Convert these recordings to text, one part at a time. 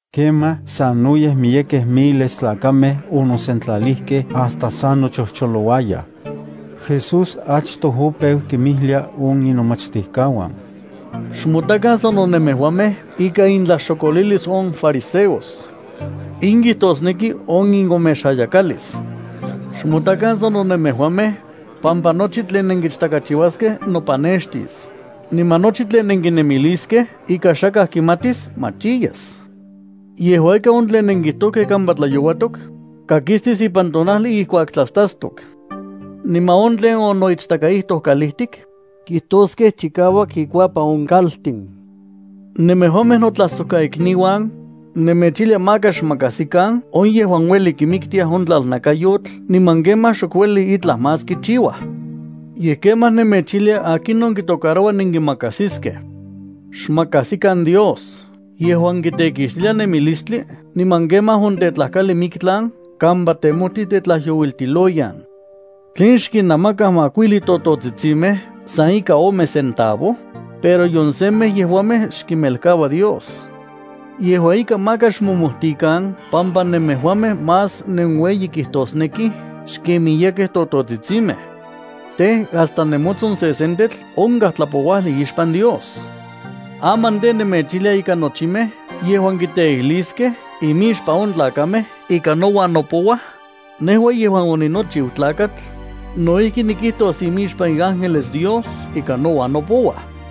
Kemaj sanoyej miyekej miles tlakamej onosentlalijkej hasta sa nochojcholouayaj. Jesús achtoj opeu kinmijlia on inomachtijkauan: —Xmotakan sano nemejuamej ikan intlaxokolilis on fariseos. In kijtosneki on inomexayakalis. Xmotakan sano nemejuamej, pampa nochi tlen nenkichtakachiuaskej nopanextis, niman nochi tlen nenkinemiliskej ika xakaj kimatis machiyas. Yejua ika, on tlen onenkijtokej kampa tlayouatotl, kakistis ipan tonajli ijkuak tlastastok. Niman on tlen onoichtakaijtoj kalijtik, kijtoskej chikauak ikuapan on kaltin. ’Nemejuamej notlajsojkaikniuan, nemechijlia maka xmakajsikan on yejuan uelij kimiktiaj on tlalnakayotl niman kemaj xok uelij itlaj más kichiuaj. Yej kemaj nemechijlia akinon kitocaroua nenkimakajsiskej. Xmakajsikan Dios yejuan kitekixtilia nemilistli niman kemaj ontetlajkali miktlan kampa temojtij tetlajyouiltiloyan. ’¿Tlen xkinnamakaj makuijli tototsitsimej san ika ome centavo? Pero nion semej yejuamej xkimelkaua Dios. Yejua ika maka xmomojtikan pampa nemejuamej más nenueyi kijtosnekij xken miyekej tototsitsinmej. Tej, hasta nemotson sesentetl onkaj tlapouajli ixpan Dios. ’Aman tej, nemechijlia ika nochimej yejuan kiteijliskej imixpan on tlakamej ika nouan nopouaj, nejua yejuan oninochiu Tlakatl, no ijki nikijtos imixpan iángeles Dios ika nouan nopouaj.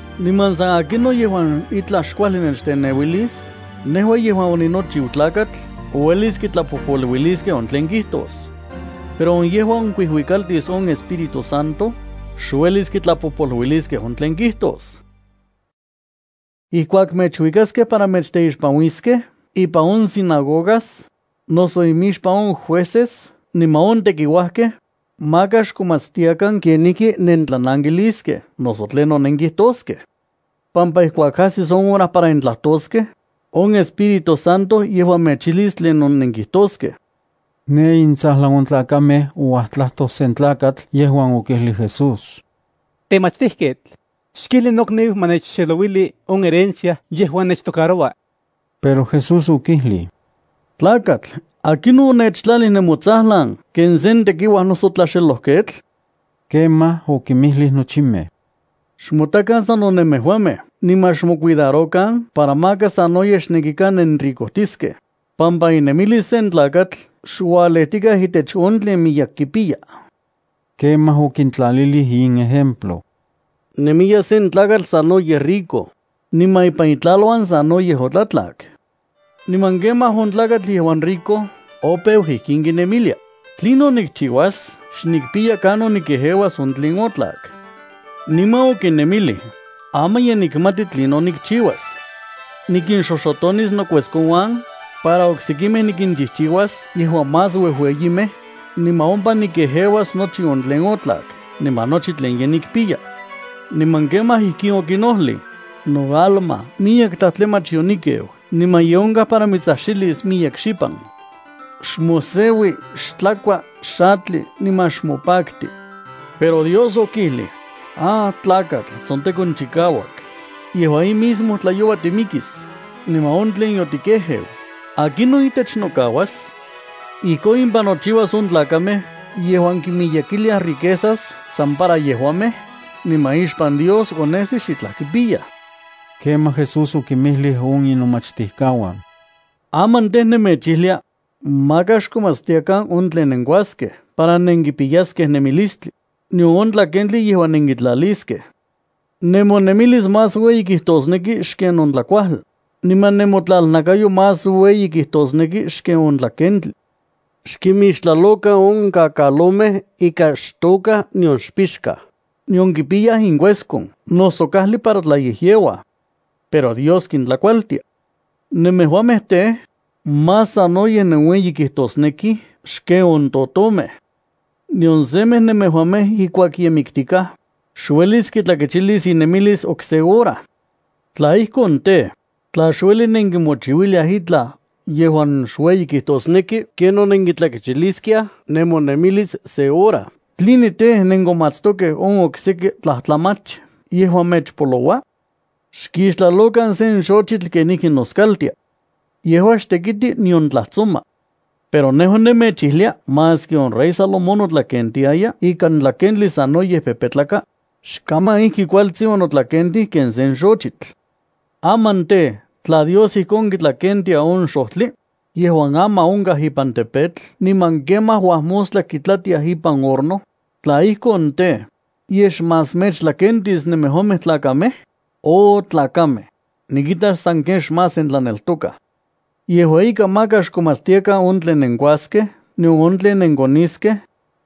’Niman san akinon yejuan itlaj xkuajli nechteneuilis, nejua yejuan oninochiu Tlakatl uelis kitlapojpoluiliskej on tlen kijtos. Pero on yejuan kuijuikaltis on Espíritu Santo, xuelis kitlapojpoluiliskej on tlen kijtos. ’Ijkuak mechuikaskej para mechteixpanuiskej ipan on sinagogas, noso imixpan on jueces niman on tekiuajkej, maka xkomatstiakan kenijki nentlanankiliskej noso tlinon nenkijtoskej, pampa ijkuak ajsis on hora para nentlajtoskej, on Espíritu Santo yejua mechijlis tlinon nenkijtoskej. Ne intsajlan on tlakamej ouajtlajtoj sen tlakatl yejuan okijlij Jesús: —Temachtijketl, xkijli nokniu ma nechxelouili on herencia yejuan nechtocaroua. Pero Jesús okijlij: —Tlakatl, ¿akinon onechtlalij nemotsajlan ken sen tekiuaj noso tlaxelojketl? Kemaj okinmijlij nochimej: —Xmotakan sano nemejuamej niman xmocuidarokan para maka sanoyej xnekikan nenricojtiskej, pampa inemilis sen tlakatl xualejtikaj itech on tlen miyek kipiya. Kemaj okintlalilij in ejemplo: —Nemiya sen tlakatl sanoyej rico, niman ipan itlaluan sanoyej otlatlak. Niman kemaj on tlakatl yejuan rico opeu ijkin kinemilia: “¿Tlinon nikchiuas? Xnikpiya kanon nikejeuas on tlen otlak.” Niman okinemilij: “Aman ye nikmati tlinon nikchiuas. Nikinxoxotonis nokueskonuan, para oksekimej nikinchijchiuas yejuan más uejueyimej, niman ompa nikejeuas nochi on tlen otlak niman nochi tlen ye nikpiya.” Niman kemaj ijkin okinojlij: “No alma, miyek tlajtlamach yonikeu niman ye onkaj para mitsajxilis miyek xipan. Xmoseui, xtlakua, xatli, niman xmopakti.” Pero Dios okijlij: “¡Ah tlakatl tsontekonchikauak! Yejua in mismo tlayoua timikis, niman on tlen yotikejeu, ¿akinon itech nokauas?” Ijkon impan nochiuas on tlakamej yejuan kimiyekiliaj riquezas para san yejuamej, niman ixpan Dios onesij xitlaj kipiyaj. Kemaj Jesús okinmijlij on inomachtijkauan: —Aman tej, nemechijlia: Maka xkomatstiakan on tlen nenkuaskej para nenkipiyaskej nemilistli, nion on tlakentli yejuan nenkitlaliskej. Nemonemilis más ueyi kijtosneki xken on tlakuajli, niman nemotlalnakayo más ueyi kijtosneki xken on tlakentli. Xkimixtlalokan on kakalomej ika xtôkaj nion pixkaj, nion kipiyaj inkueskon noso kajli para tlayejyeuaj. Pero Dios kintlakualtia. ¡Nemejuamej tej, más sanoyej nenueyikijtosnekij xken on totomej! Nion semej nemejuamej ijkuak ye miktikaj, xuelis kitlakechilis inemilis okse hora. Tla ijkon tej, tla xueli nenkimochiuiliaj itlaj yejuan xueyi kijtosneki ken on nenkitlakechiliskiaj nemonemilis se hora, “¿tline tej, nenkomatstokej on okseki tlajtlamach yejuan mechpoloua?” ’Xkixtlalokan sen xochitl kenijki noskaltia. Yejua xtekiti nion tlajtsoma. Pero nejua nemechijlia maski on rey Salomón notlakentiaya ikan tlakentli sanoyej pepetlaka, xkaman ijki kualtsin onotlakentij ken sen xochitl. Aman tej, tla Dios ijkon kitlakentia on xojtli, yejuan aman onkaj ipan tepetl niman kemaj uajmostla kitlatiaj ipan horno, tla ijkon tej, ¿yej xmás mechtlakentis nemejuamej tlakamej? ¡Oh tlakamej, nikita sanken xmás nentlaneltokaj! Yejua ika maka xkomatstiakan on tlen nenkuaskej nion on tlen nenkoniskej,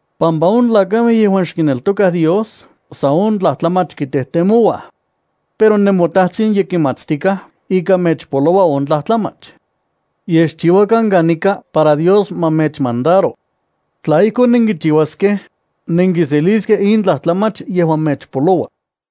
pampa on tlakamej yejuan xkineltokaj Dios san on tlajtlamach kitejtemouaj. Pero nemoTajtsin ye kimatstikaj ika mechpoloua on tlajtlamach. Yej xchiuakan kanika para Dios ma mechmandaro. Tla ijkon nenkichiuaskej, nenkiseliskej in tlajtlamach yejuan mechpoloua.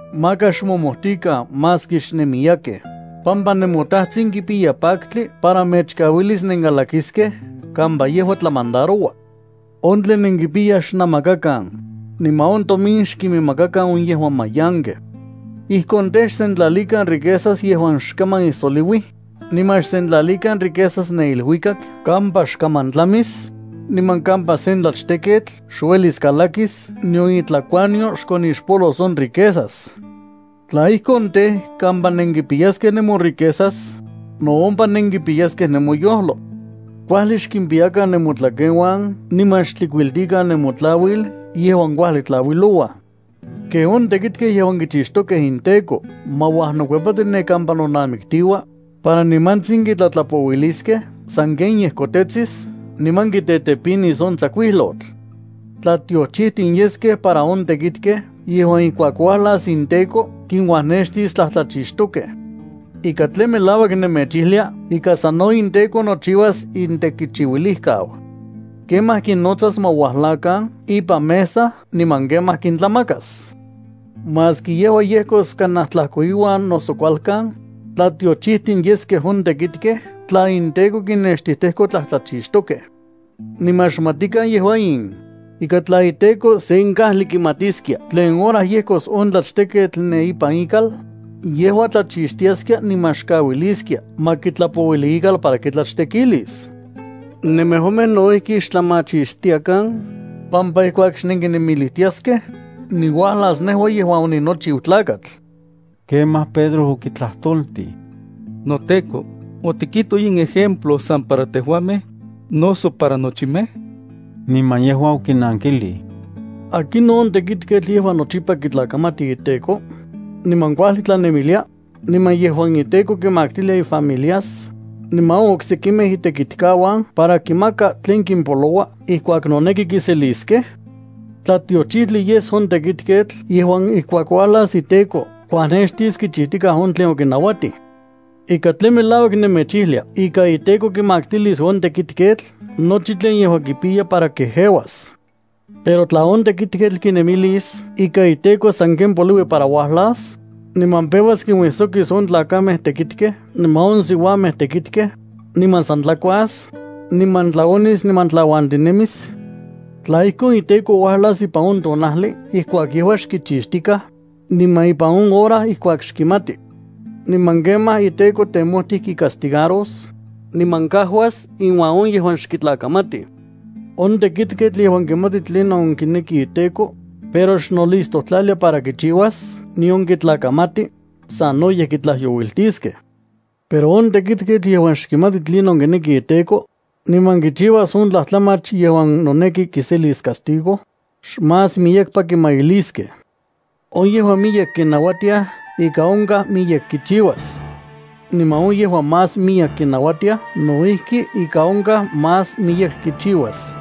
’Maka xmomojtikan maski xnenmiyekej, pampa nemoTajtsin kipiya paktli para mechkauilis nenkalakiskej kampa yejua tlamandaroua. On tlen nenkipiyaj xnamakakan, niman on tomin xkiminmakakan on yejuan mayankej. Ijkon tej, xsentlalikan riquezas yejuan xkaman ijsoliuij, niman xsentlalikan riquezas ne iluikak kampa xkaman tlamis, niman kampa sen tlachteketl xuelis kalakis nion itlakuanyo xkonixpolos on riquezas. Tla ijkon tej, kampa nenkipiyaskej nemoriquezas, no ompa nenkipiyaskej nemoyojlo. ’Kuajli xkimpiyakan nemotlakenuan niman xtlikuiltikan nemotlauil yejuan kuajli tlauilouaj, ken on tekitkej yejuan kichixtokej inteko ma uajnokuepati ne kampa nonamiktiua, para nimantsin kitlatlapouiliskej sanken yejkotetsis niman kitetepinis on tsakuijlotl. Tlatiochijtin yeskej para on tekitkej yejuan ijkuak uajlas inteko kinuajnextis tlajtlachixtokej. Ika tlen melauak nemechijlia ika sano inteko nochiuas intekichiuilijkau. Kemaj kinnotsas ma uajlakan ipan mesa niman kemaj kintlamakas. Maski yejua yejkos kanaj tlajkoiuan noso kualkan, tlatiochijtin yeskej on tekitkej tla inteko kinnextijtejko tlajtlachixtokej. Niman xmatikan yejua in, ika tla iteko sen kajli kimatiskia tlen hora yejkos on tlachteketl ne ipan ikal, yejua tlachixtiaskia niman xkauiliskia ma kitlapouili ikal para kitlachtekilis. Nemejuamej no ijki xtlamachixtiakan, pampa ijkuak xnenkinemilijtiaskej, niuajlas nejua yejuan oninochiu Tlakatl. Kemaj Pedro okitlajtoltij: —NoTEKO, ¿otikijtoj in ejemplo san para tejuamej, noso para nochimej? Niman yejua okinankijlij: —¿Akinon on tekitketl yejuan nochipa kitlakamati iteko, niman kuajli tlanemilia, niman yejuan iteko kimaktilia ifamilias, niman on oksekimej itekitkauan para kinmaka tlen kimpoloua ijkuak noneki kiseliskej? Tlatiochijtli yes on tekitketl yejuan ijkuak uajlas iteko kuajnextis kichijtikaj on tlen okinauatij. Ika tlen melauak nemechijlia ika iteko kimaktilis on tekitketl nochi tlen yejua kipiya para kejeuas. Pero tla on tekitketl kinemilis ika iteko sanken poliui para uajlas, niman peuas kinuisokis on tlakamej tekitkej niman on siuamej tekitkej, niman san tlakuas, niman tlaonis niman tlauantinemis, tla ijkon, iteko uajlas ipan on tonajli ijkuak yejua xkichixtikaj, niman ipan on hora ijkuak xkimati. Niman kemaj iteko temojtij kicastigaros, niman kajuas inuan on yejuan xkitlakamatij. ’On tekitketl yejuan kimati tlinon kineki iteko, pero xnolistojtlalia para kichiuas nion kitlakamati, sanoyej kitlajyouiltiskej. Pero on tekitketl yejuan xkimati tlinon kineki iteko, niman kichiuas on tlajtlamach yejuan noneki kiselis castigo, xmas miyekpa kimailiskej. On yejuan miyek kinauatiaj ika onkaj miyek kichiuas. Niman on yejuan más miyek kinauatiaj no ijki ika onkaj más miyek kichiuas.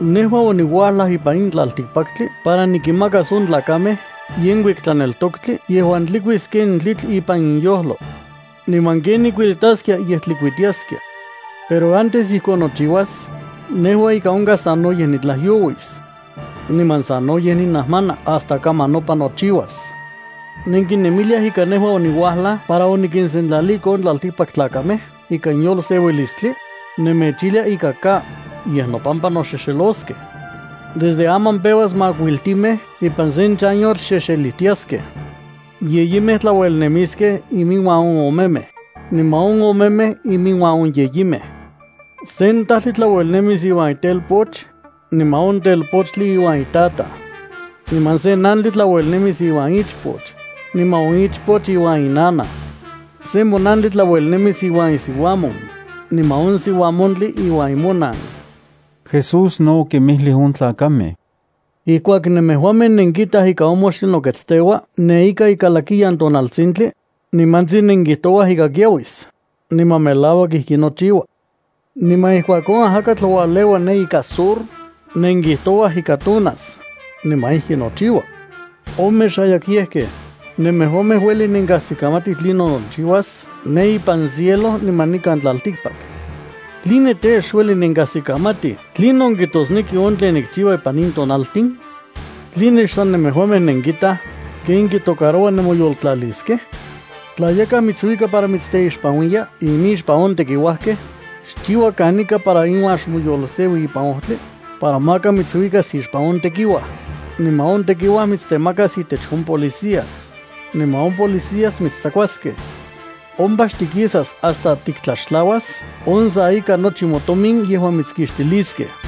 ’Nejua oniuajlaj ipan in tlaltikpaktli para nikinmakas on tlakamej yenkuik tlaneltoktli yejuan tlikuis ken tlitl ipan inyojlo. ¡Niman ken nikuelitaskia ye tlikuitiaskia! Pero antes ijkon nochiuas, nejua ika onkaj sanoyej nitlajyouis. Niman sanoyej ninajmana hasta kaman nopan nochiuas. ¿Nenkinemiliaj ika nejua oniuajlaj para onikinsentlaliko on tlaltikpaktlakamej ikan yolseuilistli? Nemechijlia ika ka, yej nopampa noxexeloskej. Desde aman peuas makuiltimej ipan sen chanyotl xexelijtiaskej. Yeyimej tlauelnemiskej iminuan on omemej, niman on omemej iminuan on yeyimej. Sen tajtli tlauelnemis iuan itelpoch, niman on telpochtli iuan itataj. Niman sen nantli tlauelnemis iuan ichpoch, niman on ichpoch iuan inanaj. Sen monantli tlauelnemis iuan isiuamon, niman on siuamontli iuan imonan. Jesús no okinmijlij on tlakamej: —Ijkuak nemejuamej nenkitaj ika on moxtli noketsteua ne ika ikalakiyan tonaltsintli, nimantsin nenkijtouaj ika kiauis, niman melauak ijki nochiua. Niman ijkuak on ajakatl ualeua ne ika sur, nenkijtouaj ika tonas, niman ijki nochiua. ¡Omexayakyejkej! Nemejuamej ueli nenkajsikamatij tlinon nochiuas ne ipan cielo niman nikan tlaltikpak. ¿Tline tej, xueli nenkajsikamatij tlinon kijtosneki on tlen nikchiua ipan in tonaltin? ’¿Tline xsan nemejuamej nenkitaj ken kitocaroua nemoyotlaliskej? Tla yakaj mitsuika para mitsteixpanuiya imixpan on tekiuajkej, xchiua kanika para iuan xmoyolseui ipan ojtli, para maka mitsuikas ixpan on tekiuaj, niman on tekiuaj mitstemakas intech on policías, niman on policías mitstsakuaskej. Ompa xtikisas hasta tiktlaxtlauas on sa ika nochi motomin yejuan mitskixtiliskej.